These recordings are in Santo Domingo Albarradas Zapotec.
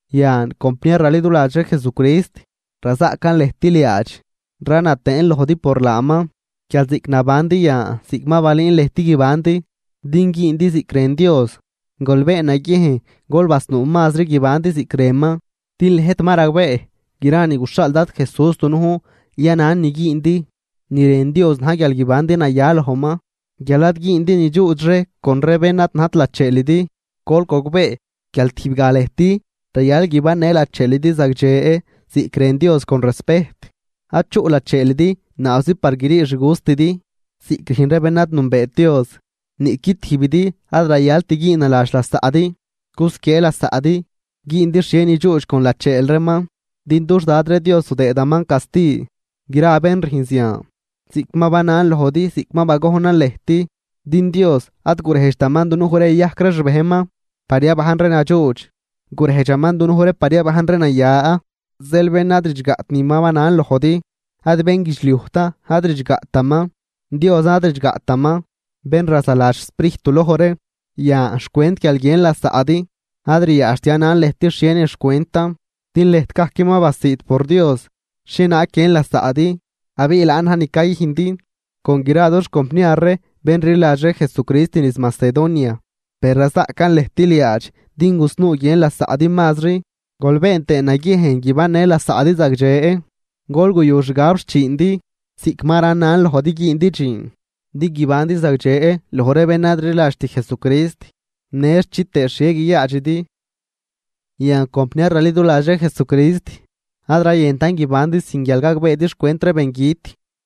Yan, compniar raliduladx ree Jesucrist, razaꞌcan lëjt liaadx, rana tëën lojdi por laaman, guial ziꞌc nabandi yan ziꞌc ma balüün lëjt guibandi, din güündi ziꞌc rën Dios, gol been naguiejn gol basnuu mazri guibandi ziꞌc rënman. Din lëjt ma ragbee gra ni guxhaal Dad Jesús dunujn yanan ni güündi. Ni rën Dios na̱j guial guibandi naya lojman, guial ad güündi nidxuudx ree con ree bén ad najt lacheelidi. Gol gogbee guial tijbgaj lëjt rayal guibannë lacheelidi zagdxe ziꞌc rën Dios con respejt, ad chuꞌ lacheelidi naabzi par grii xgustidi ziꞌc rüjn ree bén ad nünbeet Dios. Niꞌqui tijbidi ad rayalt güünnaladx lasaꞌdi, gusquiee lasaꞌdi güündi xhie nidxuudx con lacheel reeman. Din dux Dad ree Dios zudëëdaman casti gra ree bén rüjn zian, ziꞌc ma banan lojdi ziꞌc ma bagojnan lëjt. Din Dios ad gurejdxtaman dunuj ree yayajc ree xbejnman par yabajn ree nadxuudx, gurejdxaman dunuj ree par yabajn ree naya. Zeel bén ad ridxgaꞌt ni ma banan lojdi, ad bénguidxliujtan ad ridxgaꞌtaman, Diosan ad ridxgaꞌtaman, bén razaladx xSprijt duloj ree. Yan, xcwent guial guiën lasaꞌdi, ad ryaadxt yanan lëjt xhienin xcwentan, din lëjt gajc ma basiid por Dios xhienaag guiën lasaꞌdi, abiꞌ laan na̱j ni cayüjndi con gra dux compniar ree bén rliladx ree Jesucrist niz Macedonia. Per razaꞌcan lëjt liaadx din gusnuu guiën lasaꞌdi mazri. Gol been tëë naguiejn guibannë lasaꞌdi zagdxe, gol guyu xgab xchiindi, ziꞌc ma ranan lojdi güündi dxiin, din guibandi zagdxe loj ree bén ad rliladxt Jesucrist në chitëë xhie guiyaadxidi. Yan, compniar raliduladx ree Jesucrist, ad rayëntan guibandi sin guial gagbeedi xcwent ree bengüt,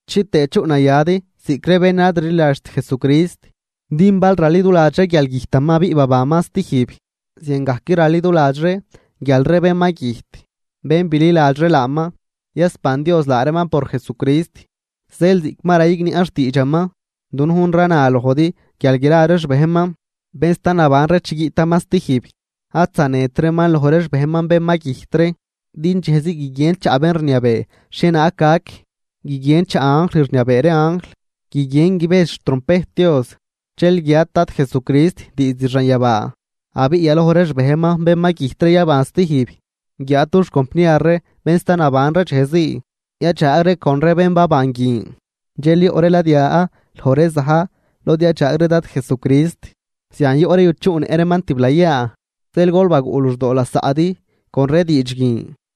chitëë chuꞌnayadi ziꞌc ree bén ad rliladxt Jesucrist. Din bal raliduladx ree guial güjtaman abiꞌ babanman stijb, ziangajc raliduladx ree guial ree bén ma güjt, bén bililadx ree laaman, yasban Dios laa reeman por Jesucrist. Zeel ziꞌc ma rayigniaꞌn xtiidxaman, dunujn rana lojdi guial gra ree xbejnman, bén sta naban ree chi guiꞌtaman stijb, ad zanedt reeman loj ree xbejnman bén ma güjt ree. Din dxejzii guiguien chaꞌ bén rniabee xhienaag gac, guiguien chaꞌ anjl rniabee ree anjl, guiguien guibejdx xtrompejt Dios. Dxel guiat Dad Jesucrist diizd xanyabaa, abiꞌ yaloj ree xbejnman bén ma güjt ree yaban stijb. Guiáad dux compniar ree bén sta naban ree dxejzii, yadxaag ree con ree bén baban guin, dxel yoꞌ ree ladya loj ree za̱j lod yadxaag ree Dad Jesucrist. Zian yoꞌ ree yuchuꞌnëꞌ reeman tiblayaa. Zeel gol baguꞌ luxdoo lasaꞌdi con ree diidx guin.